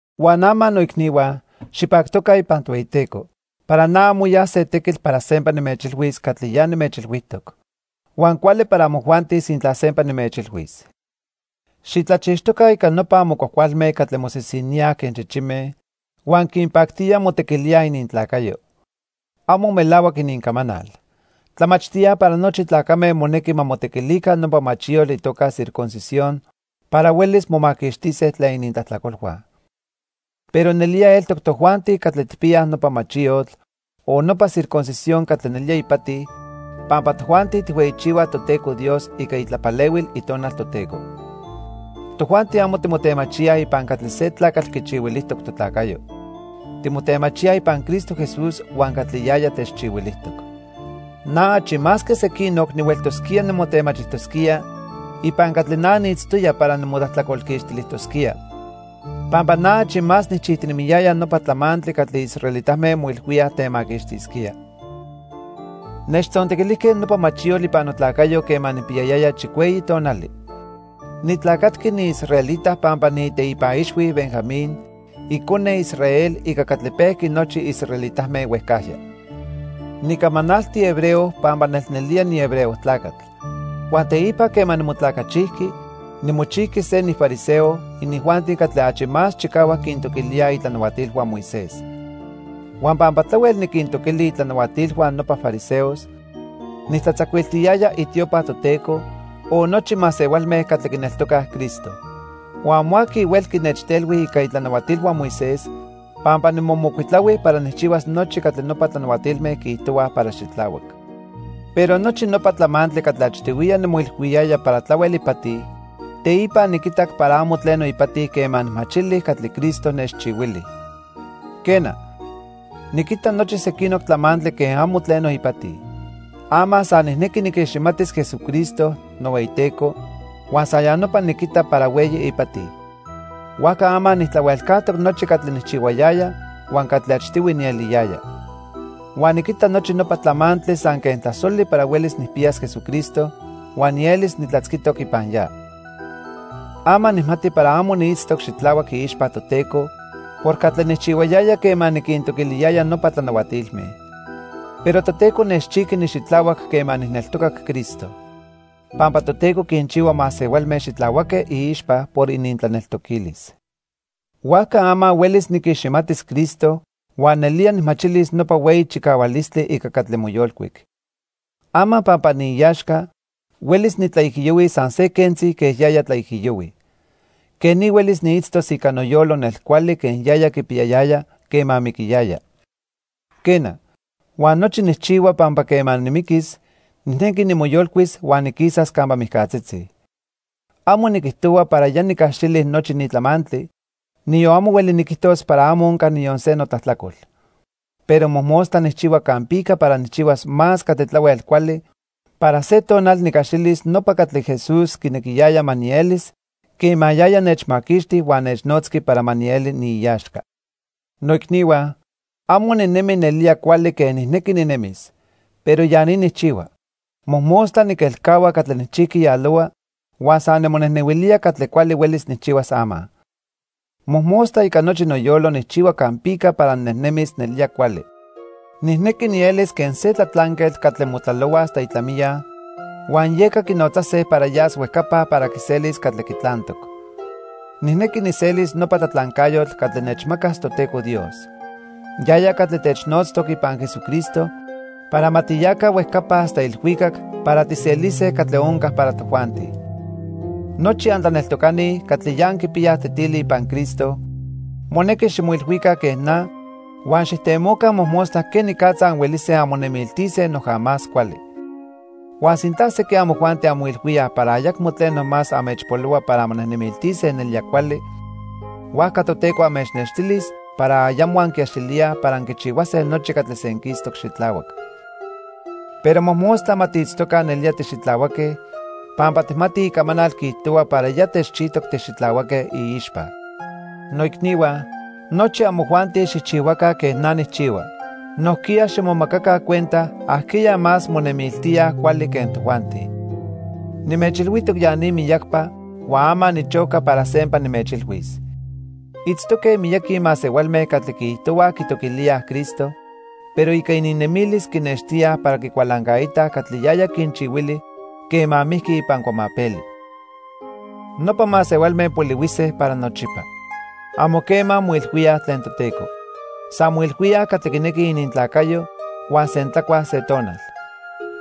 Huan ama, noicnihua, xipactoca ipan Tohueyiteco. Para na amo ya se tequitl para sempa nimechilhuis catli ya nimechilhuijtoc. Huan cuali para amojuanti sintla sempa nimechilhuis. Xitlachixtoca ica nopa amo cuajcualme catli mosisiníaj quen chichime huan quinpactía motequilíaj inintlacayo. Amo melahuac inincamanal. Tlamachtíaj para nochi tlacame monequi ma motequilica nopa machiyotl itoca circuncisión para huelis momaquixtise tlen inintlajtlacolhua. Pero nelía eltoc tojuanti catli tijpiyaj nopa machiyotl o nopa circuncisión catli nelía ipati, pampa tojuanti tijhueyichihuaj Toteco Dios ica itlapalehuil Itonal Toteco. Tojuanti amo timotemachíaj ipan catli se tlacatl quichihuilijtoc totlacayo. Timotemachíaj ipan Cristo Jesús huan catli yaya techchihuilijtoc. Na achi más que sequinoc nihueltosquía nimotemachijtosquía ipan catli na niitztoya para nimotlajtlacolquixtilijtosquía. Pampa na achi más nijchijtinemiyaya nopa tlamantli catli israelitame moilhuíaj temaquixtisquía. Nechtzontequilijque nopa machiyotl ipan notlacayo quema nijpiyayaya chicueyi tonali. Nitlacatqui niisraelita pampa niiteipan ixhui Benjamín, icone Israel ica catli pejqui nochi israelitame huejcajya. Nicamanalti hebreo pampa nelnelía nihebreo tlacatl. Huan teipa quema nimotlacachijqui, nimochijqui se nifariseo, inijuanti catli achi más chicahuac quintoquilíaj itlanahuatilhua Moisés. Huan pampa tlahuel niquintoquili inintlanahuatilhua nopa fariseos, nijtlatzacuiltiyaya itiopa Toteco, o nochi masehualme catli quineltocaj Cristo. Huan amo aqui huelqui nechtelhui ica itlanahuatilhua Moisés, pampa nimomocuitlahui para nijchihuas nochi catli nopa tlanahuatilme quiijtohuaj para xitlahuac. Pero nochi nopa tlamantli catli achtihuiya nimoilhuiyaya para tlahuel ipati, teipa niquitac para amo tleno ipati quema nijmachili catli Cristo nechchihuili. Quena, niquita nochi sequinoc tlamantli quen amo tleno ipati. Ama san nijnequi niquiximatis Jesucristo, nohueyiTeco, huan san ya nopa niquita para hueyi ipati. Huajca ama nijtlahuelcajtoc nochi catli nijchihuayaya huan catli achtihui nieliyaya. Huan niquita nochi nopa tlamantli san quen tlasoli para huelis nijpiyas Jesucristo, huan nielis nitlatzquitoc ipan ya. Ama nijmati para amo niitztoc xitlahuac iixpa Toteco por catli nijchihuayaya quema niquintoquiliyaya nopa tlanahuatilme. Pero Toteco nechchijqui nixitlahuac quema nijneltocac Cristo. Pampa Toteco quinchihua masehualme xitlahuaque iixpa por inintlaneltoquilis. Huajca ama huelis niquiximatis Cristo huan nelía nijmachilis nopa hueyi chicahualistli ica catli moyolcuic. Ama pampa niiaxca, huelis nitlaijiyohuis san se quentzi quen yaya tlaijiyohui. Quej ni huelis niitztos ica noyolo nel cuali quen yaya quipiyayaya quema miquiyaya. Quena, huan nochi nijchihua pampa quema nimiquis, nijnequi nimoyolcuis huan niquisas campa mijcatzitzi. Amo niquijtohua para ya nicaxili nochi ni tlamantli, niyon amo hueli niquijtos para amo onca niyon se notlajtlacol. Pero mojmostla nijchihua campica para nijchihuas más catli tlahuel cuali para se tonal nicaxilis nopa catli Jesús quinequiyaya ma nielis quema yaya nechmaquixti huan nechnotzqui para ma nieli niiaxca. Noicnihua, amo ninemi nelía cuali quen nijnequi ninemis. Pero ya ni nijchihua: Mojmostla niquelcahua catli nijchijqui yalohua huan san nimonejnehuilía catli cuali huelis nijchihuas ama. Mojmostla ica nochi noyolo nijchihua campica para ninejnemis nelía cuali. Nijnequi nielis quen se tlatlanquetl catli motlalohua hasta itlamiya huan yeca quinotzase para yas huejcapa para quiselis catli quitlantoc. Nijnequi nijselis nopa tlatlancayotl catli nechmacas Toteco Dios. Yaya catli technotztoc ipan Jesucristo para ma tiyaca huejcapa hasta ilhuicac para tijselise catli onca para tojuanti. Nochi antlaneltocani catli ya anquipiyaj tetili ipan Cristo monequi ximoilhuica quen na huan xijtemoca mojmostla quenicatza anhuelise anmonemiltise noja más cuali. Huan sintla sequin amojuanti anmoilhuíaj para ayacmo tleno más anmechpolohua para anmonejnemiltise nelía cuali, huajca Toteco anmechnextilis para ayamo anquiaxilíaj para anquichihuase nochi catli senquistoc xitlahuac. Pero mojmostla ma tiitztoca nelía tixitlahuaque pampa tijmatij icamanal quiijtohua para ya techchijtoc tixitlahuaque iixpa. Noicnihua, nochi amojuanti xijchihuaca quen na nijchihua. Nojquiya ximomacaca cuenta ajqueya más monemiltíaj cuali quen tojuanti. Nimechilhuijtoc ya ni miyacpa huan ama nichoca para sempa nimechilhuis. Itztoque miyaqui masehualme catli quiijtohuaj quitoquilíaj Cristo, pero ica ininnemilis quinextíaj para quicualancaitaj catli yaya quinchihuili quema mijqui ipan cuamapeli. Nopa masehualme polihuise para nochipa. Amo quema moilhuíaj tlen Toteco. San moilhuíaj catli quinequij inintlacayo huan sentlacuaj se tonal.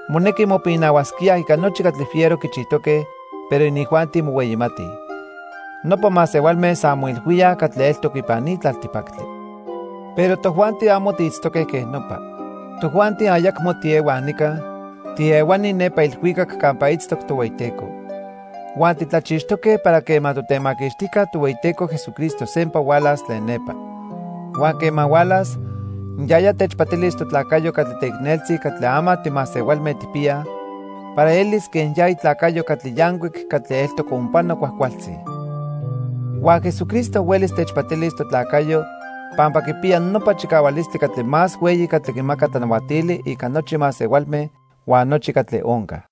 Monequi mopinahuasquíaj ica nochi catli fiero quichijtoque, pero inijuanti mohueyimatij. Nopa masehualme san moilhuíaj catli eltoc ipan ni tlaltipactli. Pero tojuanti amo tiitztoque quej nopa. Tojuanti ayacmo tiehuaj nica, tiehuani nepa ilhuicac campa itztoc Tohueyiteco. Huan titlachixtoque para quema Totemaquixtijca Tohueyiteco Jesucristo sempa hualas tlen nepa. Huan quema hualas, yaya techpatilis totlacayo catli teicneltzi catli ama timasehualme tijpiyaj para elis quen ya itlacayo catli yancuic catli eltoc onpano cuajcualtzi. Huan Jesucristo huelis techpatilis totlacayo pampa quipiya nopa chicahualistli catli más hueyi catli quimaca tlanahuatili ica nochi masehualme huan nochi catli onca.